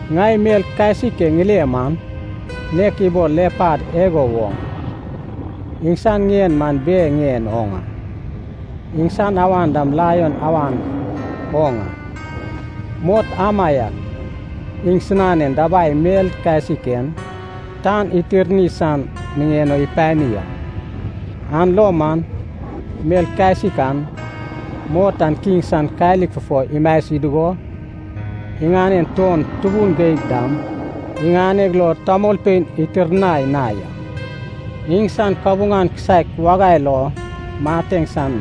Ŋai mel kasik e ŋile man, nek ibol lepad igo woŋ a. Iŋsan ŋien man bear ŋien oŋ a. Iŋsan awan dam laion awan oŋ a. Mot amaiak iŋsinan dabai mel kasik en tan itirni san niŋen o ipani a. An lo man mel kasik an, mot an kiŋ san kalik fufo imasi dugo, iŋanen tuon tubun geig dam iŋaneg lo tamolpein itirnai na ya. Iŋsan kabuŋan kisaek wagai lo mateŋ san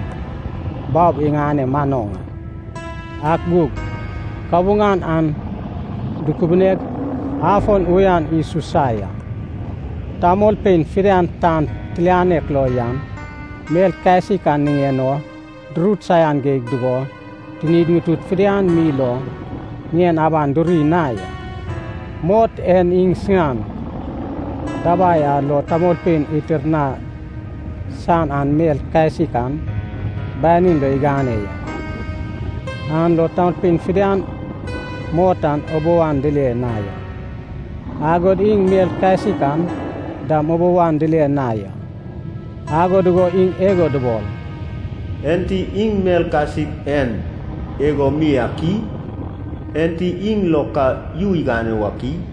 baob iŋane manoŋ a, ak gug kabuŋan an dukubuneg afon uyan isusa ya. Tamolpein fidian tan tilianek lo yan mel kasik an niŋen o durut saian geig dugo tinid ŋutud fidian mi lo ŋien aban duri na ya. Mot en iŋsinan dabai a lo tamolpein itirnai san an mel kasik an banin lo igane ya, an lo tamolpein fidian mot an ubou an dile na ya. Agod iŋ mel kasik an dam ubou an dile na ya. Ago dugo iŋ igo dubol, “Enti iŋ mel kasik en igo mi ak i? Enti iŋ lo ka yu igane wak i?”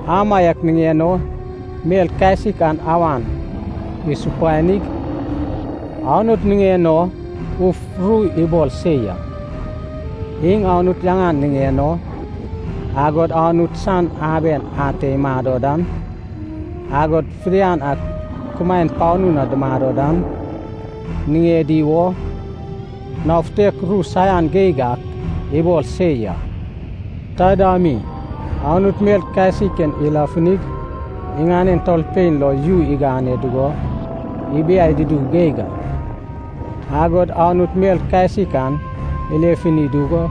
Amaiak niŋen o mel kasik an awan isupanig, Anut niŋen o uf ru ibol se ya. Iŋ Anut yaŋan niŋen o, agod Anut san aben ate imado dan, agod fidian a kumaen panu na dumado dan, niŋedi wo nao futek ru saian geig ak ibol se ya. Taida mi, Anut mel kasik en ilefunig iŋanen tamolpein lo yu igane dugo ibiai dudu geig a. Agod Anut mel kasik an ilefuni dugo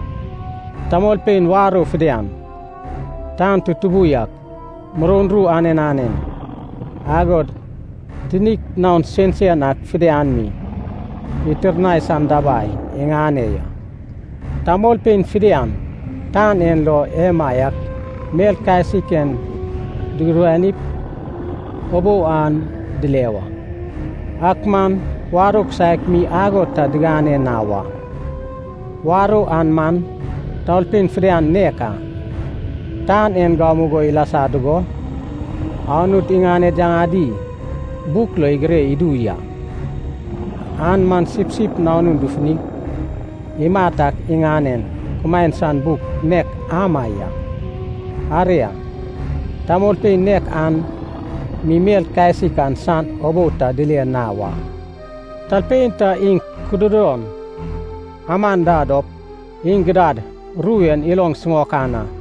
tamolpein warou fidian, tan tutubu yak, muroun ru anen anen, agod tinik naon sensen ak fidian mi itirnai san dabai iŋane ya. Tamolpein fidian tan en lo emaiak mel kasik en dugudanip ubou an dile wa. Ak man warou kisaek mi ago ta digane na wa. Warou an man, tamolpein fidian nek a, tan en gamugo ilasa dugo, Anut iŋaned yaŋadi buk lo igire idu ya. An man Sipsip Nanun dufunig imat ak iŋanen kumaen san buk nek ama ya. Aria, tamolpein nek an mi mel kasik an san ubou ta dile na wa. Talpein ta iŋ kududon aman da dop, iŋ gidad ru en iloŋ siŋaokan a.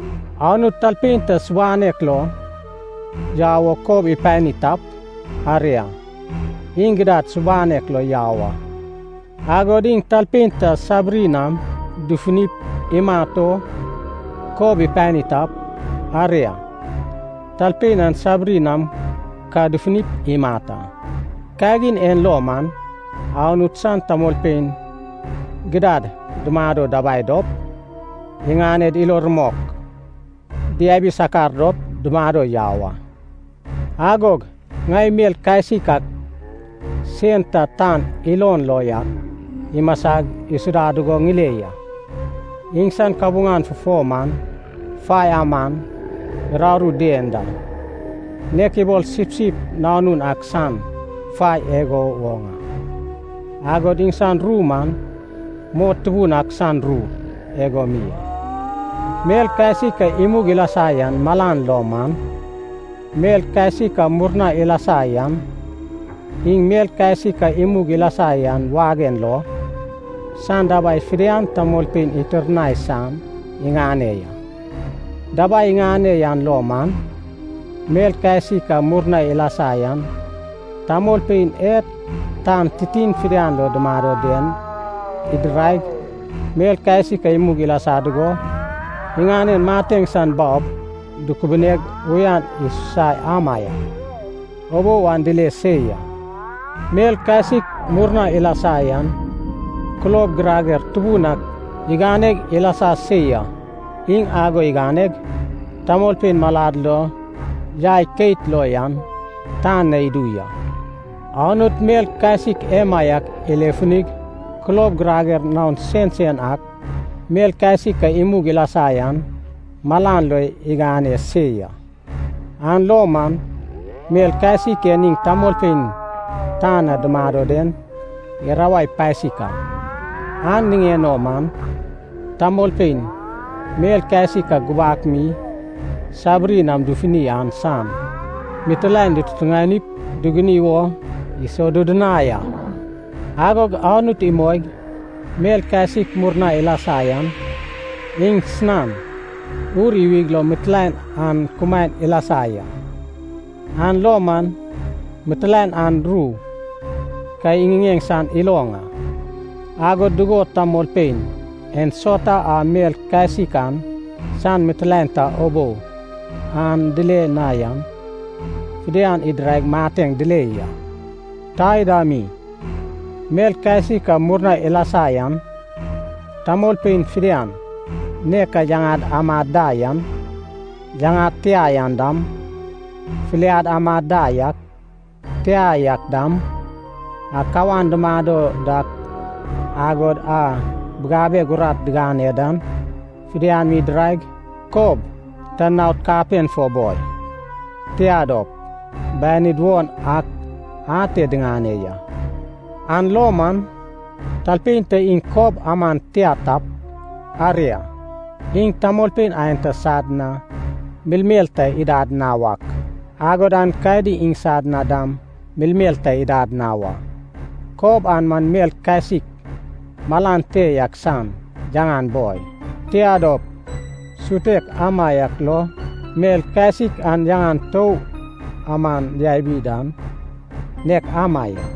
Anut talpein ta subanek lo yau wo kob ipani tap, aria, iŋ gidad subanek lo yau a. Agod iŋ talpein ta sabiri nam dufunip imat o kob ipani tap, aria, talpein an sabiri nam ka dufunip imat a. Kagin en lo man, Anut san tamolpein gidad dumado dabai dop iŋaned ilo rumok diabi sakar dop dumado yau a. Agog ŋai mel kasik ak sen ta tan ilon lo yak imasag isuda dugo ŋile ya. Iŋsan kabuŋan fufo man fai aman uraru dien da, nek ibol sipsip nanunan ak san fai igo woŋ a. Agod iŋsan ru man mot tubun ak san ru igo mi a. Mel kasik a imug ilasa yan malan lo man, mel kasik a murna ilasa yan, iŋ mel kasik a imug ilasa yan wagen lo, san dabai fidian tamolpein itirnai san iŋane ya. Dabai iŋane yan lo man, mel kasik a murna ilasa yan tamolpein e tan titin fidian lo dumado den idiraig, mel kasik a imug ilasa dugo iŋanen mateŋ san baob dukubuneg uyan isusa amaiak, ubou an dile se ya. Mel kasik murna ilasa yan kulob girager tubun ak iganeg ilasa se ya. Iŋ ago iganeg, tamolpein malad lo yai keit lo yan tan na idu ya. Anut mel kasik emaiak ilefunig kulob girager naon sensen ak, mel kasik a imug ilasa yan malan lo igane se ya. An lo man mel kasik en iŋ tamolpein tan na dumado den irawai pasik a, an niŋen o man tamolpein mel kasik a gubak mi sabiri nam dufuni an san mitilaen ditutuŋanip duguni wo isodudunai a. Agod Anut imoig mel kasik murna ilasa yan iŋsinan ur iwig lo mitilaen an kumaen ilasa ya. An lo man mitilaen an ru ka iŋiŋeŋ san iloŋ a, agod dugo tamolpein ensauta a mel kasik an san mitilaen ta ubou an dile na yan fidian idiraig mateŋ dile ya. Taida mi, mel kasik a murna ilasa yan tamolpein fidian nek a yaŋad amad da yan, yaŋad tia yan dam, filiad amad da yak, tia yak dam, a kawan dumado dak agod a bigabeg urat digane dan, fidian mi idiraig kob ta naod kapen fo boi, tia dop, banid won ak ate diŋane ya. An lo man, talpein ta iŋ kob aman tia tap, aria, iŋ tamolpein aenta sad na melmel ta idad na wak, agod aenkadi iŋsan na dam melmel ta didad na wa. Kob an man mel kasik malan te yak san yaŋan boi, tia dop, sutek amaiak lo mel kasik an yaŋan tou aman yabi dan, nek ama ya.